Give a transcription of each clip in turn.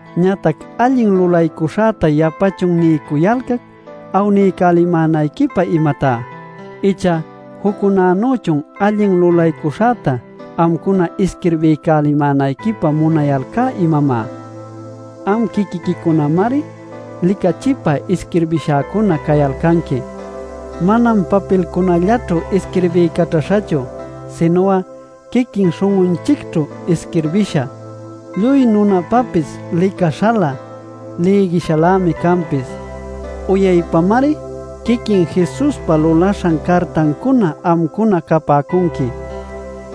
Ñatac ¿allin lulaycuśhäta yapachun niycuyalcac awniycälimänayquipä, imatá? ¿Icha juccunanüchun allin lulaycuśhäta amcuna isquirbiycälimänayquipä munayalcá, imamá? Am quiquiquicunamari licachipä isquirbïshacuna cayalcanqui. Manam papilcunallaćhu isquirbiycaćhäśhachu, sinu'a quiquin śhun'unchicćhu isquirbïsha, lluy nunapapis licaśhalä, lïgishalämi canpis. Uyaypamari quiquin Jesuspa lulaśhan cartancuna amcuna capäcunqui.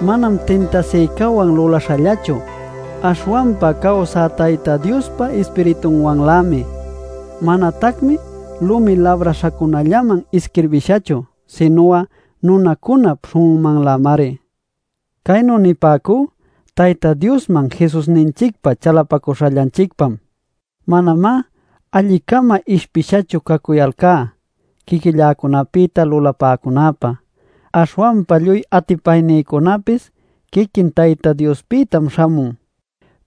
Manam tintasïcawan luläśhallachu, aśhwanpa cawsä Tayta Diospa Ispiritunwanlämi. Manatacmi lumi labräśhacunallaman isquirbïshachu, sinu'a nunacunap śhun'unmanlämari. Caynu nipäcú Tayta Diosman Jesusninchicpa chalapacuśhallanchicpam. Manamá alli-cama ishpishachu cacuyalcá quiquilläcunapïta lulapäcunäpä. Aśhwanpa lluy atipaynïcunapis quiquin Tayta Diospïtam śhamun.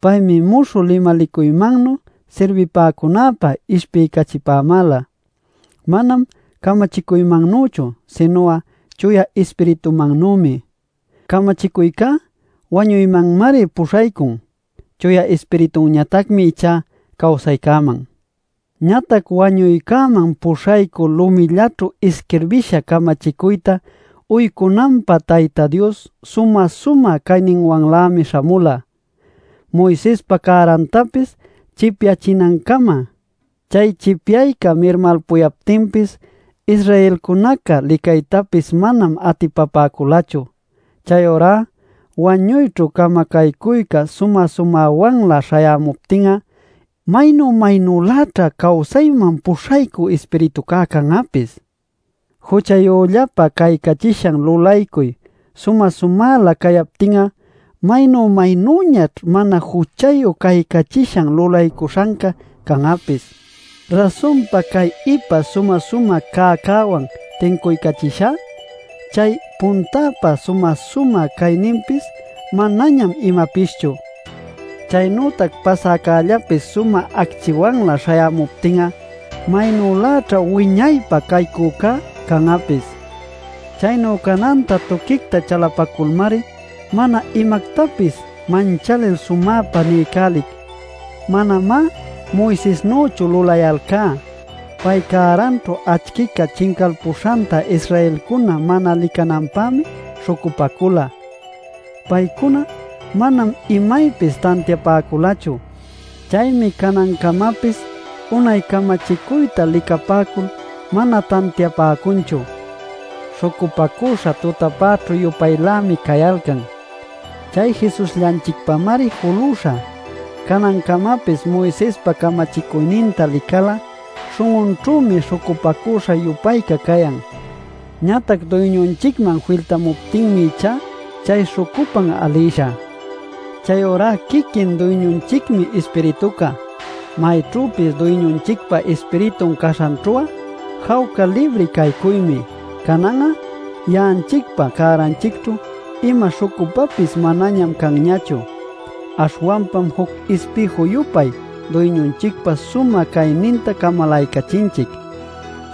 Paymi muśhü limalicuymannuy sirbipäcunäpä ishpiycachipämäla; manam camachicuymannüchu, sinu'a Chuya Ispiritumannümi. Camachicuycá wañuymanmari puśhaycun; Chuya Ispiritunñatacmi ichá cawsaycäman. Ñatac wañuycäman puśhaycü lumillaćhu isquirbïsha camachicuyta uycunanpä Tayta Dios sumä-sumä cayninwanlämi śhamula Moisespa cärantapis chipyachinancama. Chay chipyayca mirmalpuyaptinpis Israelcunaca licaytapis manam atipapäculachu. Chayurá wañuyćhu camacaycüca sumä-sumäwanlä śhayämuptin'a, ¡maynu maynüläćha cawsayman puśhaycü Ispiritucá can'apis! Juchayüllapa caycachishan lulaycuy sumä-sumälä cacuyaptin'a ¡maynu-maynüñaćh mana juchayu caycachishan lulaycuśhancá can'apis! Rasunpa cay ipa sumä-sumä cäcäwan tincuycachishá, chay puntäpa sumä-sumä cayninpis manañam imapischu. Chaynütac pasäcällapis sumä acchiwanlä śhayämuptin'a, ¡maynüläćha wiñaypä caycücá can'apis! Chaynu cananta tuquicta chalapaculmari, mana imactapis manchalil sumäpa niycälic. Manamá Moisesnüchu lulayalcá. Pay cäranćhu acchica chincalpuśhanta Israelcuna mana licananpämi śhucupacula. Paycuna manam imaypis tantiapäculachu. Chaymi canancamapis unay camachicuyta licapäcul mana tantiapäcunchu; śhucupacüśha tutapäćhü-yupaylämi cayalcan. Chay Jesusllanchicpamari julüśha. Canancamapis Moisespa camachicuyninta lical'a śhun'unćhümi śhucupacüśha-yupayca cayan. Ñatac Duyñunchicman filtamuptinmi ichá chay śhucupan alïsha. Chayurá quiquin Duyñunchicmi Ispirituca. Mayćhüpis Duyñunchicpa Ispiritun caśhanćhu'a jawca libri caycuymi. Canan'a ya'anchicpa cäranchicćhu ima śhucupapis manañam canñachu. Aśhwanpam juc ispïju-yupay Duyñunchicpa sumä cayninta camalaycachinchic;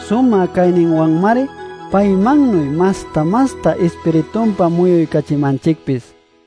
sumä cayninwanmari paymannuy masta-masta Ispiritunpa muyuycachimanchicpis.